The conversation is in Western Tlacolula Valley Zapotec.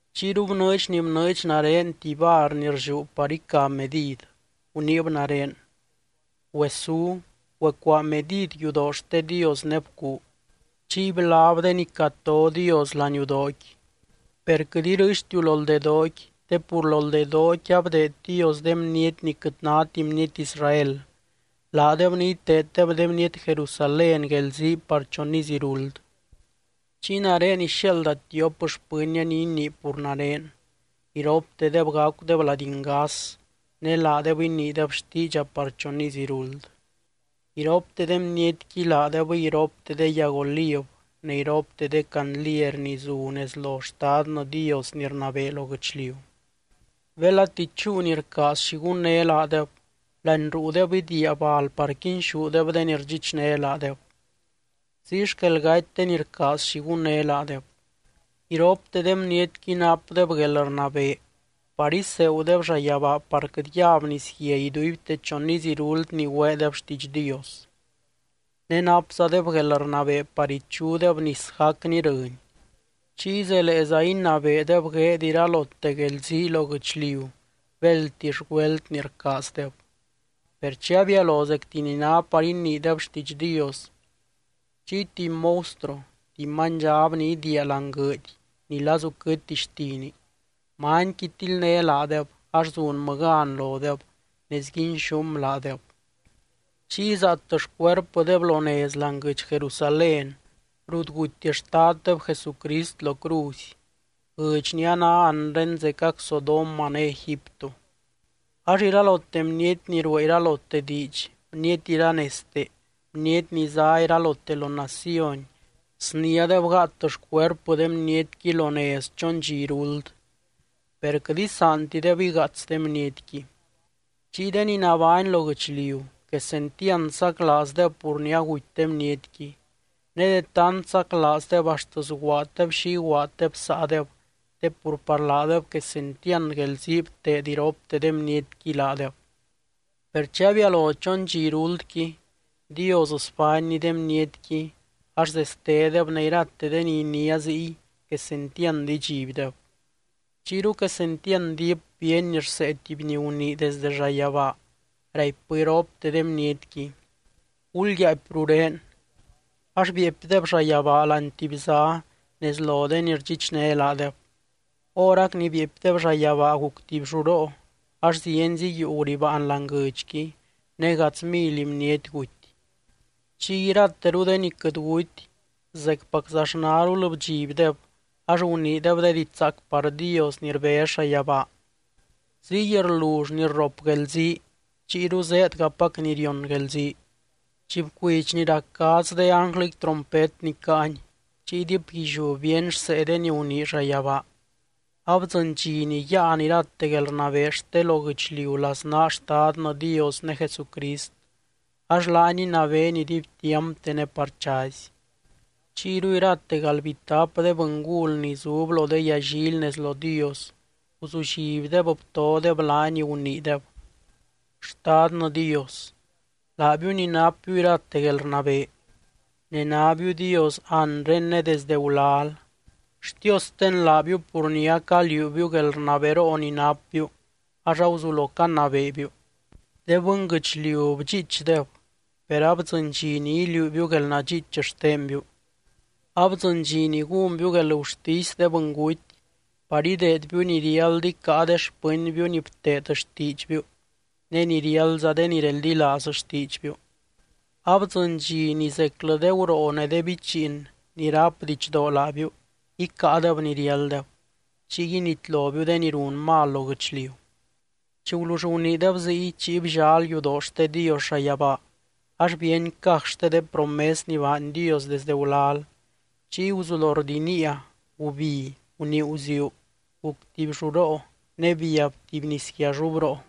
Chiyru bnɨɨdx ni bnɨɨdx nare tuby var ni rlliú par ica medid, guniib nare: —Güesú, güecuaa medid yudoo xte Dios ne bcuu, chiy blab de ni cato Dios laniudooqui. Per quɨt irɨɨxtiu loldedooqui te pur loldedooqui abdeed Dios de bniety ni quɨt náti bniety Israel, laadeb ni iteeddeb de bniety Jerusalén guelzii par chon iz iruld. Chiy nare ixiaalda tiop xpɨnnia ni inii pur nare. Iroptedeb gacudeb lady ngas, ne laadeb iniideb xtiidxa par chon iz iruld. Iropte de bnietqui laadebɨy iropte de yag oliv ne iropte de candliery ni zu nez lo Xtadnɨ Dios ni rnabee lo guɨchliu. Belati chúu ni rcaaz xi gunné laadeb, láani ruudeb idiia bal par quinxúdeb de ni rdxichné laadeb. Ziy xquel gaty de ni rcaaz xi gunné laadeb. Iropte de bnietqui napdeb guelrnabee par iseegudeb llayabaa par quɨt yab nisguia iduibte chon iz iruld ni güeedeb xtiidx Dios. Ne napzadeb guelrnabee par ichudeb nis gacni rɨny, chiy zeleeza inabeedeb gueed iralote guelzii lo guɨchliu béldtix güelt ni rcaazdeb. Per chi abialo zecti ni ná par iniideb xtiidx Dios, chiy tuby monstruo, tuby manydxab ni idiia láani guɨɨdy ni lazu quɨtti xtini, manyqui tildné laadeb ax zunmɨ gan lodeb ne sguinxúm laadeb. Chiy zaat xcuerpɨdeb lo nez láani guɨdx Jerusalén rut guty Xtaddeb Jesucrist lo cruzy, guɨdx ni a ná anre zecac Sodoma ne Egipto. Ax iralote bniety ni ruee iralote diidx, bniety iranezte, bniety ni zá iralote lo naciony sniádeb gáat xcuerpɨ de bnietqui lo nez chon dxi iruld, per quɨt isaantideb igaats de bnietqui. Chiy de ni nabány lo guɨchliu, quesentiand saclaazdeb pur ni aguty de bnietqui. Ne de tant saclaazdeb axt sguaaddeb xi iguaaddeb saadeb, te pur par laadeb quesentiand guelzii bteed iropte de bnietqui laadeb. Per chi abialo chon dxi iruldqui, Dios sbánny de bnietqui ax zestedeb ne irate de ni iniá ziy quesentiand idxibdeb. Chiyru quesentiand diip bíeny rsee tuby ni gunii desde llayabaa, raipbɨ iropte de bnietqui: —Gulyaapy rurén. Ax bieepydeb llayabaa láani tuby zá nez lo de ni rdxichné laadeb. Horac ni bieepydeb llayabaa guc tuby lluroo ax zienzi yuu guribaan láani guɨdxqui ne gadz mily bniety guty. Chiy irateru de ni quɨt guty zecpaczaxnarul bdxibdeb, ax guniideb de diidx zaac par Dios ni rbez llayabaa. Ziy rlull ni rrop guelzii, chiyru zéedgapac ni rion guelzii. Chi bcuidx ni rac gadz de ánglɨqui trompet ni caany, chiy diipguilliú bíeny rsee de ni gunii llayabaa: Abdzɨny dxi ni yáan irate guelrnabee xte lo guɨchliu laznaa Xtadnɨ Dios ne Jesucrist ax laany inabeeny iduibtiampte ne par chazy. Chiyru irate galdbitap de bɨngul ni zub lo de yallily nez lo Dios, guzullibdeb btodeb laany, guniideb: Xtadnɨ Dios, laabiu ni napbiu irate guelrnabee ne nábiu Dios anre ne desdɨ gulal. Xtiosten laabiu pur ni acaliuubiu guelrnaberoo ni napbiu ax aguzulo canabeebiu. De bɨnguɨchliu bdxiichdeb, per abdzɨny dxi ni iliuubiu guelnadxiich xtenbiu. Abdzɨny dxi ni gúnbiu guelgurtisy de bɨnguty par ideedbiu ni riáld icáa de xpɨnbiu ni bteed xtiidxbiu ne ni riáldza de ni reldilaaz xtiidxbiu. Abdzɨny dxi ni zeclɨ de guroo ne de bichiin ni ráp didxdoo laabiu icáadeb ni riálddeb, chiy initlobiu de ni run mal lo guɨchliu. Chi gulull guniideb ziy, chiy bllal yudoo xte Dios llayabaa ax bíeny caj xte de promes ni baany Dios desde gulal. Chiy guzulo rdiniia, gubi, gunii guziuu, guc tuby lluroo ne biab tuby nisguiallubroo.